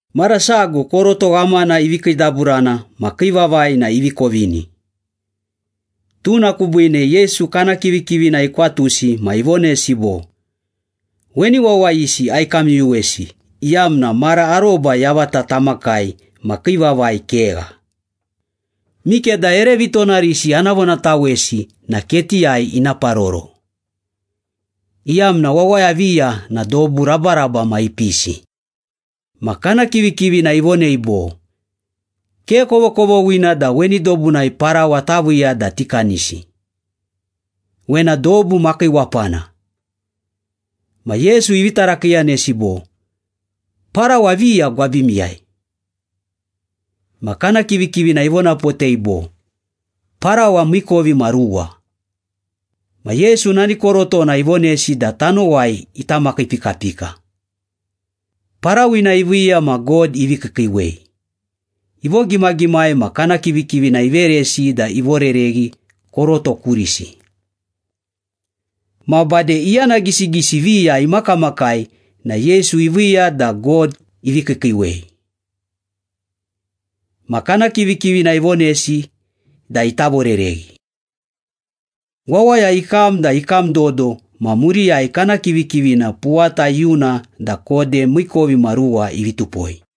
Mara sago koroto ghamana ivi kiidaburana ma kii vavai na ivi kovini. Tuna kubiine Yesu kana kivikivina ikwatusi ma ivonesi bo, “Weni wawayisi aikamyuyuwesi iyamna mara aroba yavata tamakai ma kii vavai kegha. Mikeda ere vitonarisi ana vonatawesi na ketiyai ina paroro, iyamna wawaya viya na dobu rabaraba ma ipisi.” Ma kana kivikivina ivonei bo, “Ke kovokovoghina da weni dobunai parawa taviiya da tikanisi. Wena dobu makiiwapana.” Ma Yesu ivi tarakiiyanesi bo, “Parawa viya gwabimiyai?” Ma kana kivikivina ivonapotei bo, “Parawa miikovimaruwa.” Ma Yesu nani korotona ivonesi da tanowai ita makiipikapika. Parawina iviiya ma God ivi kiikiiwei, ivogimagimai ma kana kivikivina iveresi da ivorereghi koroto kurisi. Ma bade iyana gisigisi viya imakamakai na Yesu iviiya da God ivi kiikiiwei. Ma kana kivikivina ivonesi da ita vorereghi. Wawaya ikam da ikam dodo ma muriyai kana kivikivina puwata iyuna da kode miikovimaruwa ivi tupoi.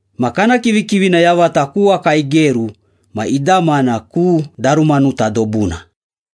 Ma kana kivikivina yavata ku waka igeru ma idamana ku Darumanuta dobuna.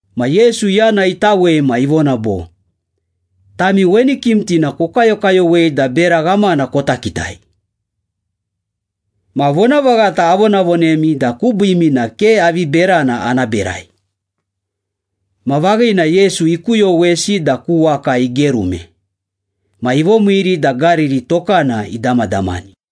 Ma Yesu yana itawei ma ivona bo, “Tami weni kimtina kokayokayowei da bera ghamana kota kitai. Ma vonavaghata avonavonemi da kubiimi na ke avi berana ana berai.” Ma vaghina Yesu ikuyowesi da ku waka igerume, ma ivomiiri da Gariri tokana idamadamani.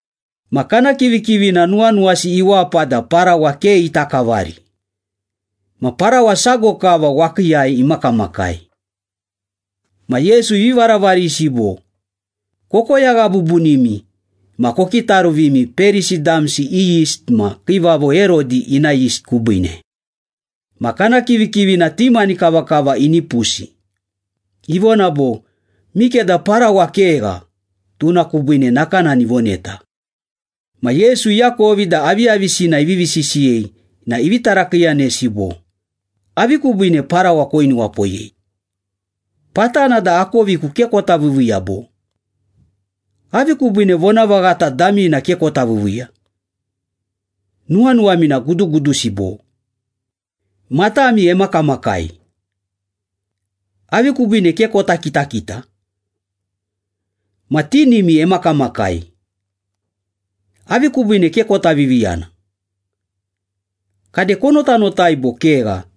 Ma kana kivikivina nuwanuwasi iwapa da parawa ke ita kavari. Ma parawa sago kava wakiiyai imakamakai. Ma Yesu ivi varavarisi bo, “Kokoyagha bubunimi ma kokitaruvimi Perisi damsi i yist ma Kiivavo Herodi ina yist kubiine.” Ma kana kivikivina ti mani kavakava inipusi, ivona bo, “Mikeda parawa kegha, tuna kubiine nakanani ivoneta.” Ma Yesu iakovi da aviyavisina ivivi sisiyei na ivi tarakiiyanesi bo, “Avi kubiine parawa koinuwapoyei? Patana da akoviku ke kota viiviiya bo? Avi kubiine vonavaghata damina ke kota viiviiya? Nuwanuwami na gudugudusi, bo? Matami emakamakai. Avi kubiine ke kota kitakita? Ma tinimi emakamakai. Avi kubiine ke kota viviyana? Kade konotanotai bo kegha,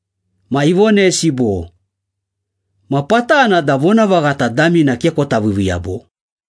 Ma ivonesi bo, “Ma patana da vonavaghata damina ke kota viiviiya, bo?”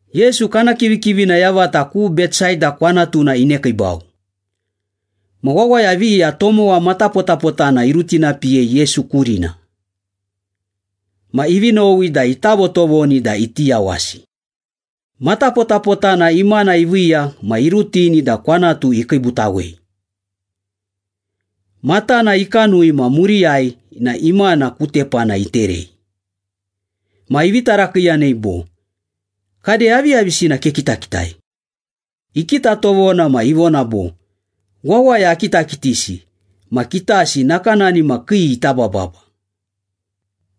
Yesu kana kivikivina yavata ku Betsaida kwanatuna inekiibau. Ma wawaya viya tomowa matapotapotana irutinapiyei Yesu kurina. Ma ivi nowi da ita votovoni da iti yawasi. Matapotapotana imana iviiya ma irutini da kwanatu ikiibutawei. Matana ikanui ma muriyai na imana ku tepana iterei. Ma ivi tarakiiyanei bo, “Kade aviyavisina kekitakitai?” Ikita tovona ma ivona bo, “Wawaya akitakitisi ma kitasi nakanani ma kii ita bababa.”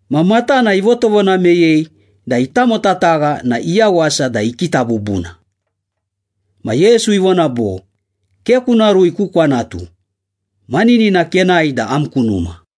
Ma matana ivotovona meyei da itamotatagha na iyawasa da ikita bubuna. Ma Yesu ivona bo, “Ke kuna rui ku kwanatu. Maninina kenae da am ku numa.”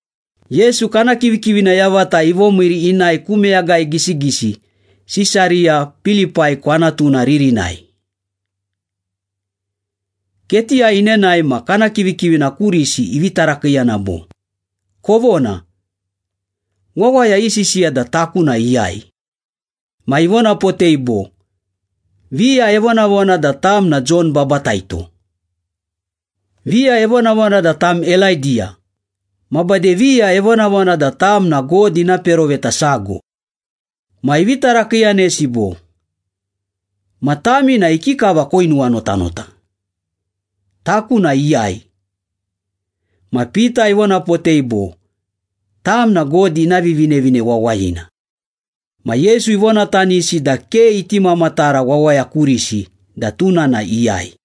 Yesu kana kivikivina yavata ivomiiri inae ku meyagai gisigisi Sisariya Pilipai kwanatuna ririnai. Ketiyai inenae ma kana kivikivina kurisi ivi tarakiiyana bo, “Kovona. Wawaya isisiya da taku na iyai?” Ma ivonapotei bo, “Viya evonavona da tam na Jon Babataito. Viya evonavona da tam Elaidiya, ma bade viya evonavona da tam na God ina peroveta sago.” Ma ivi tarakiiyanesi bo, “Ma tami na ikikava koinuwanotanota? Taku na iyai?” Ma Pita ivonapotei bo, “Tam na God ina Vivinevine Wawayina.” Ma Yesu ivonatanisi da ke iti mamatara wawaya kurisi da tuna na iyai.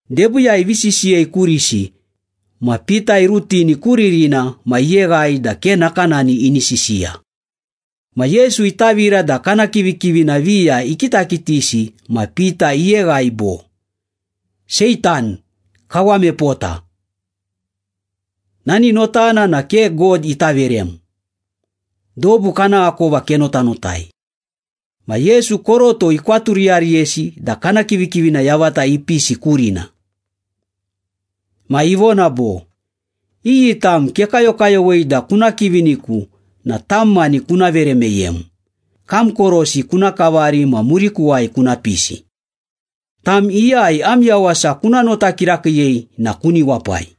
Debiiyai ivi sisiyei kurisi, ma Pita irutini ku ririna ma iyeghai da ke nakanani ini sisiya. Ma Yesu itavira da kana kivikivina viya ikitakitisi ma Pita iyeghai bo, “Seitan, kawam epota! Nani notana na ke God ita verem. Dobu kana akova kenotanotai.” Ma Yesu koroto ikwaturiyariyesi da kana kivikivina yavata ipisi kurina. Ma ivona bo, “Iyi tam kekayokayowei da kuna kiviniku na tam mani kuna vere meyem, kam korosi kuna kavari ma murikuwai kuna pisi. Tam iyai am yawasa kuna nota kirakiiyei na kuni wapai.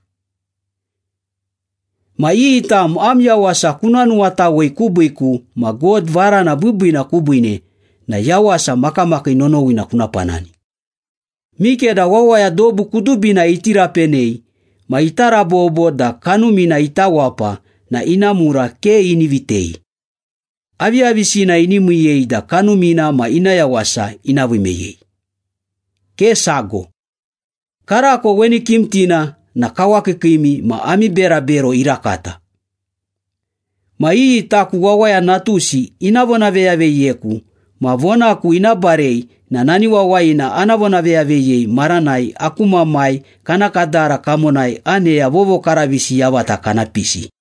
Ma iyi tam am yawasa kuna nuwatawei kubiiku ma God varana biibiina kubiine na yawasa makamakii nonowina kuna panani. Mikeda wawaya dobu kudubina iti rapenei ma ita rabobo da kanumina ita wapa na ina mura ke ini vitei. Aviyavisina ini miiyei da kanumina ma ina yawasa ina vii meyei? Ke sago. Karako weni kimtina na kawakiikiimi ma ami berabero irakata. Ma iyi taku Wawaya Natusi ina vonaveyaveyiyeku ma vonaku ina barei na nani wawayina ana vonaveyaveyiyei maranai aku Mamai kana kadara kamonai aneya vovokaravisi yavata kana pisi.”